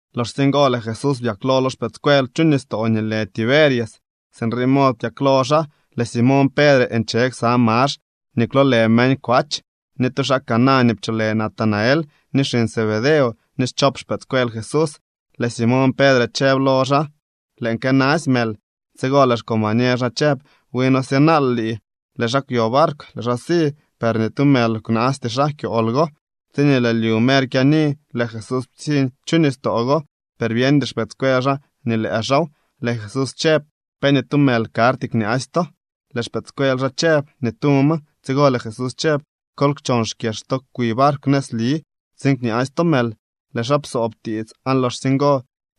Loxsye ngo, lëë Jesús byaklo lo xpëëdscuel chu nistoo nii lë Tiberias. Sinrii mod byaklo xaa. Lëë Simoñ Pedre nche ksa Max nii kwloolë meñ Kwach, ni tu xaa Caná nii pcholë Natanael, ni xiñ Zebedeo, ni schop xpëëdscuel Jesús. Lëë Simoñ Pedre chëb lo xaa: —Lëën kënasy mël. Tsigo lëë xcombañer xaa chëb: —Wi noo syënaal lii. Lëë xaa kwyo barkw, lëë xaa si. Per ni tu mël kwnaasty xaa kyool go. Tsiñee lëë lyu mer kyaani, lëë Jesús ptsiñ chu nistoo go, per byeñdy xpëëdscuel xaa nii lëë xaaw. Lëë Jesús chëb: —¿Pe ni tu mël karty kñaasy to? Lëë xpëëdscuel xaa chëb: —Ni tu ma. Tsigo lëë Jesús chëb: —Kol kchon xkyex to kwi barkw nëzli tsiin kñaasy to mël. Lëë xaa psoob tiits, aan loxsye ngo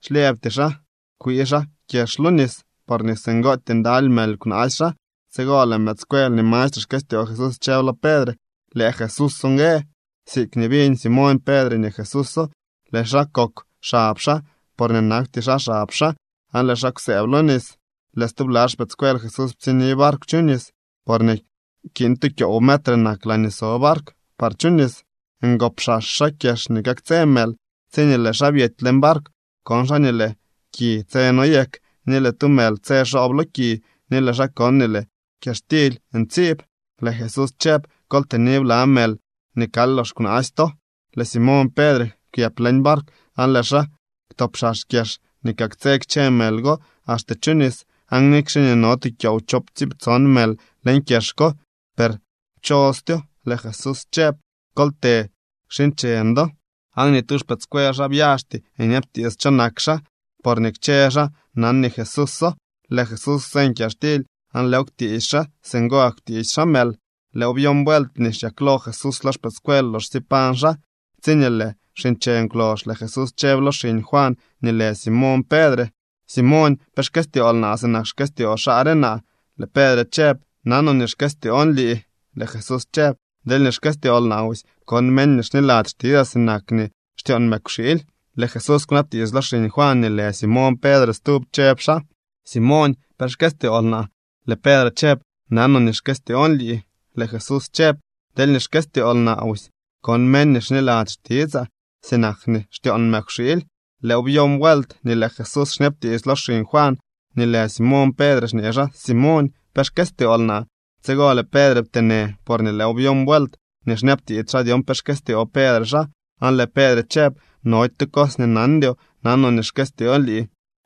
xlyëbty xaa kwii xaa kyex lo nis, porñee singootyee ndaly mël kwnaasy xaa. Tsigo lëë mëëdscuel nii mastre xkëstyoo Jesús chëb lo Pedre: —¡Lëë Jesús ngue! Siikñee biñ Simoñ Pedre nii Jesúso, lëë xaa kokw xab xaa, porñee nakwty xaa xab xaa, aan lëë xaa kwsëëb lo nis. Lëë stubla xpëëdscuel Jesús ptsiñni barkw chu nis, porñee kiin tu kyoow metre nak laañee so barkw par chu nis. Ngopxax xaa kyex nii kaktsë mël. Tsiñee lëë xaa byety leñ barkw, kon xaa nii lëë ki tse noyek, ni lëë tu mël tse xoob lo ki, ni lëë xaa kon nii lëë kyaxtily ntsiib. Lëë Jesús chëb: —Kol tëni bla mël nii kal lox kwnaasy to. Lëë Simoñ Pedre kwyëp leñ barkw aan lëë xaa kwtopxax kyex nii kaktsë kchë mël ngol axte chu nis. Aan nikxe nii no tu kyoow choowptsiiptson mël leñ kyex ko, per pchostyo. Lëë Jesús chëb: —Kol të kxiincheñ do. Aan ni tu xpëëdscuel xaa byaxty nyabtiits cho nak xaa, porñee kchë xaa nan nii Jesúso. Lëë Jesús kwseñ kyaxtily aan lëëw kwtiisy xaa. Singo gak kwtiisy xaa mël. Lëëw byon vuelt nii xyaklo Jesús lo xpëëdscuel loxsye pañ xaa. Tsiñee lëë wxiincheñ kwlox, lëë Jesús chëb lo xiñ Juan nii lë Simoñ Pedre: —Simoñ, ¿pe xkëstyool naa sinak nii xkëstyoo xaa re naa? Lëë Pedre chëb: —Nanoo nii xkëstyoon lii. Lëë Jesús chëb: —Deelñee xkëstyool naa busy, kon meñ nii xniladzy xtitsaa sinak nii xtyoon mëkwxiily. Lëë Jesús kwnabtiits lo xiñ Juan nii lë Simoñ Pedre stub, chëb xaa: —Simoñ, ¿pe xkëstyool naa? Lëë Pedre chëb: —Nanoo nii xkëstyoon lii. Lëë Jesús chëb: —Deelñee xkëstyool naa busy, kon meñ nii xniladzy xtitsaa sinak nii xtyoon mëkwxiily. Lëëw byon vuelt nii lëë Jesús xñabtiits lo xiñ Juan nii lë Simoñ Pedre xñee xaa: —Simoñ, ¿pe xkëstyool naa? Tsigo lëë Pedre pteenë, porñee lëëw byon vuelt nii xñabtiits xaa dyon pe xkëstyoo Pedre xaa, aan lëë Pedre chëb: —Nody tu cos nii nandyoo. Nanoo nii xkëstyoon lii.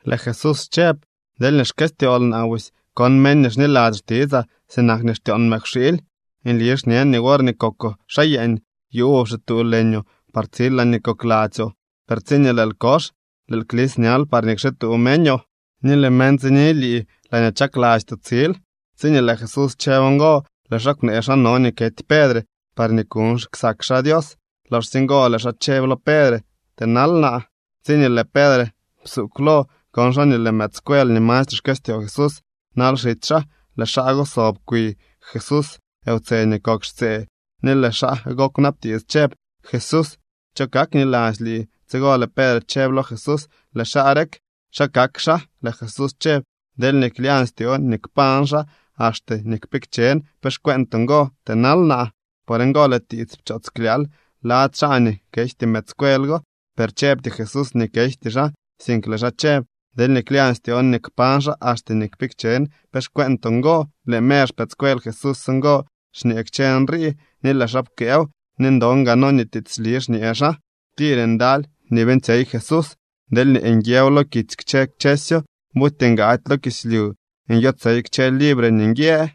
Lëë Jesús chëb: —Deelñee xkëstyool naa busy, kon meñ nii xniladzy xtitsaa sinak nii xtyoon mëkwxiily. Nli xñen nii worñee kokoo xaa yeeñ, yuuboo pxituu leñoo par tsil laañee kokladzyoo. Per tsiñee lëël kox, lëël klis ñal parñee kxituu meñoo, ni lëë meñ tsini lii laañee chaklastyoo tsil. Tsiñee lëë Jesús chëb ngo, lëë xaa kwnee xa no nii kety Pedre parñee kuuñ ksak xaa Dios. Loxsye ngo lëë xaa chëb lo Pedre: —¡Tënal naa! Tsiñee lëë Pedre psuugw lo, kon xaa nii lëë mëëdscuel nii mastre xkëstyoo Jesús nal xitsy xaa. Lëë xaa go sob kwi Jesús wtse nii kok xtsee, ni lëë xaa go kwnabtiits chëb: “Jesús, ¿cho kakniladzy lii?” Tsigo lëë Pedre chëb lo Jesús: —Lëë xaa rek, ¿xa kak xaa? Lëë Jesús chëb: —Deelñee klyañ styoon nii kpañ xaa axte nii kpikchen, ¿pe xcueentoo ngo? Tënal naa. Por ngo lëë tiits pchoots klyaal lady xaa nii kejty mëëdscuel go. Per chëbty Jesús nii kejty xaa, sink lëë xaa chëb: “Deelñee klyañ styoon nii kpañ xaa axte nii kpikchen, ¿pe xcueentoo ngo?” Lëë mer xpëëdscuel Jesús ngo xñee kchë nrii, ni lëë xaa pkëëw. Ni ndon gaa noo nii tiitsli xñee xaa. Tir ndaly nii beeñtsyey Jesús. Deelñee nguiëw lo kitsy kchë kchësyo, buty ngaady lo kislyu nyotsey kchësy libre nii nguië.